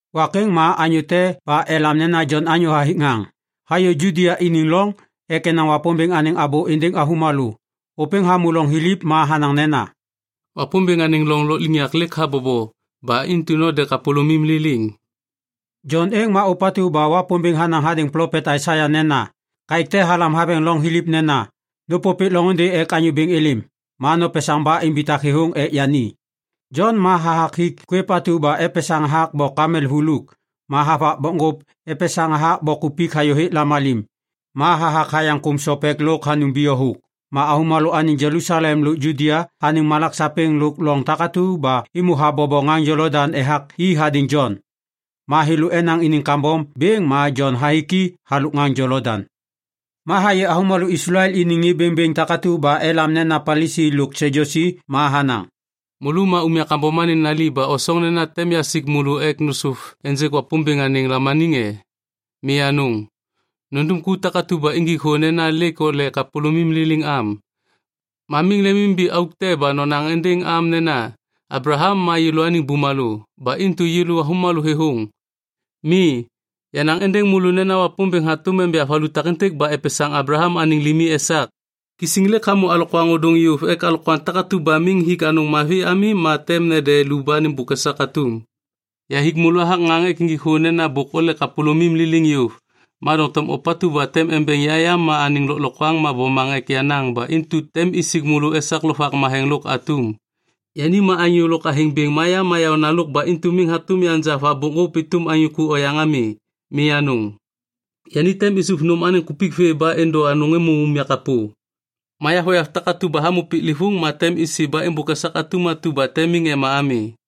Wak êŋ ma anyô te ba elam nena “Jon anyô hathik ŋaŋ” hayô Judia iniŋ loŋ ek enaŋ Wapômbêŋ anêŋ abô êndêŋ avômalô. Ôpêŋ hamô loŋ thiliv ma hanaŋ nena, “Wapômbêŋ anêŋ loŋ lôkliŋyak lêk habobo. Ba intu node kapôlômim liliŋ.” Jon êŋ ma ôpatu ba Wapômbêŋ hanaŋ hadêŋ plopet Aisaia nena, “Kaêk te halam haveŋ loŋ thiliv nena, ‘Nôpôpêk loŋôndê ek Anyô Bêŋ êlêm, ma nopesaŋ ba imbitak thêthôŋ ek yani.’” Jon ma hathak hik kwêv atu ba epesaŋ hathak bok kamel vuluk ma havak bokŋgôp epesaŋ hathak bok kupik hayôhêk lamalim. Ma hathak hayaŋ kôm sopek lôk hanum biyo thôk. Ma avômalô anêŋ Jelusalem lôk Judia anêŋ malak sapêŋ lôk loŋ takatu ba êmô habobo ŋaŋ Jolodaŋ ethak i hadêŋ Jon. Ma thêlô enaŋ iniŋ kambom bêŋ ma Jon hathik i halôk ŋaŋ Jolodaŋ. Ma hayê avômalô Islael iniŋ ŋê bêŋbêŋ takatu ba elam nena Palisi lôk Sadyusi ma hanaŋ, “Môlô ma umya kambom anêŋ nali ba osoŋ nena tem yasik môlô ek nôsôv ênjêk Wapômbêŋ anêŋ lamaniŋ e? Mi anôŋ! Nundum ku takatu ba injik thô nena lêk ole kapôlômim liliŋ am. Ma miŋ lemimimbi auk te ba nonaŋ êndêŋ am nena, ‘Ablaham ma yêlôaniŋ bumalô. Ba intu yêlô avômalô thêthôŋ.’ Mi, yanaŋ êndêŋ môlô nena Wapômbêŋ hatôm enja valu takêntêk ba epesaŋ Ablaham anêŋ limi esak. Kisiŋ lêk hamô alokwaŋ ôdôŋ yôv, ek alokwaŋ takatu ba miŋ hik anêŋ anôŋ mavi ami, ma tem nede lu ba nêmbôk esak atum. “Yahathik môlô hathak ŋaŋ ek injik thô nena bôk ole kapôlômim liliŋ yôv. Ma doŋtom ôpatu ba tem embeŋ ya yam anêŋ lôklokwaŋ ma bomaŋ ek yenaŋ ba intu tem isik môlô esak Lovak Matheŋ lôk atum. Yani ma anyô lôk athêŋ bêŋ ma ya ma yaônalôk ba intu miŋ hatôm yanja anêŋ va bokŋgôp êtôm anyô ku oyaŋ ami. Mi anôŋ. Yani tem isuv nôm anêŋ kupik vê ba êndô anôŋ êmô unyak kapô. Ma yavoyav takatu ba hamô piklêvôŋ ma isi ba êmbôk esak atum atu ba tem miŋ ema ami.”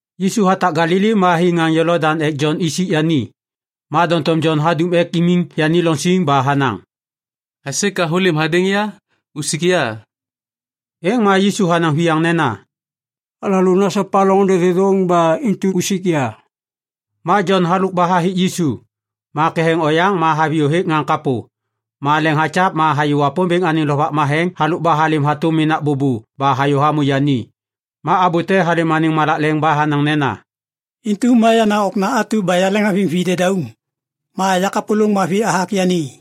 Yisu hatak Galili ma hi ŋaŋ Jolodaŋ ek Jon isik yani. Ma doŋtom Jon hadum ek imiŋ yani loŋ siŋ ba hanaŋ, “Aisê ka hôlêm hadêŋ ya? Usik ya.” Êŋ ma Yisu hanaŋ viyaŋ nena, “Alalô nasopa loŋôndê thêthôŋ ba intu usik ya.” Ma Jon halôk ba hathik Yisu. Ma ketheŋ oyaŋ ma haviyô hêk ŋaŋ kapô. Ma leŋ hakyav ma hayê Wapômbêŋ anêŋ Lovak Matheŋ halôk ba halêm hatôm menak bôbô ba hayô hamô yani. Ma abô te halêm anêŋ malak leŋ ba hanaŋ nena, “Intu ma yenaŋ Okna atu ba yaleŋhaviŋ videdauŋ. Ma ya kapôlôŋ mavi hathak yani.”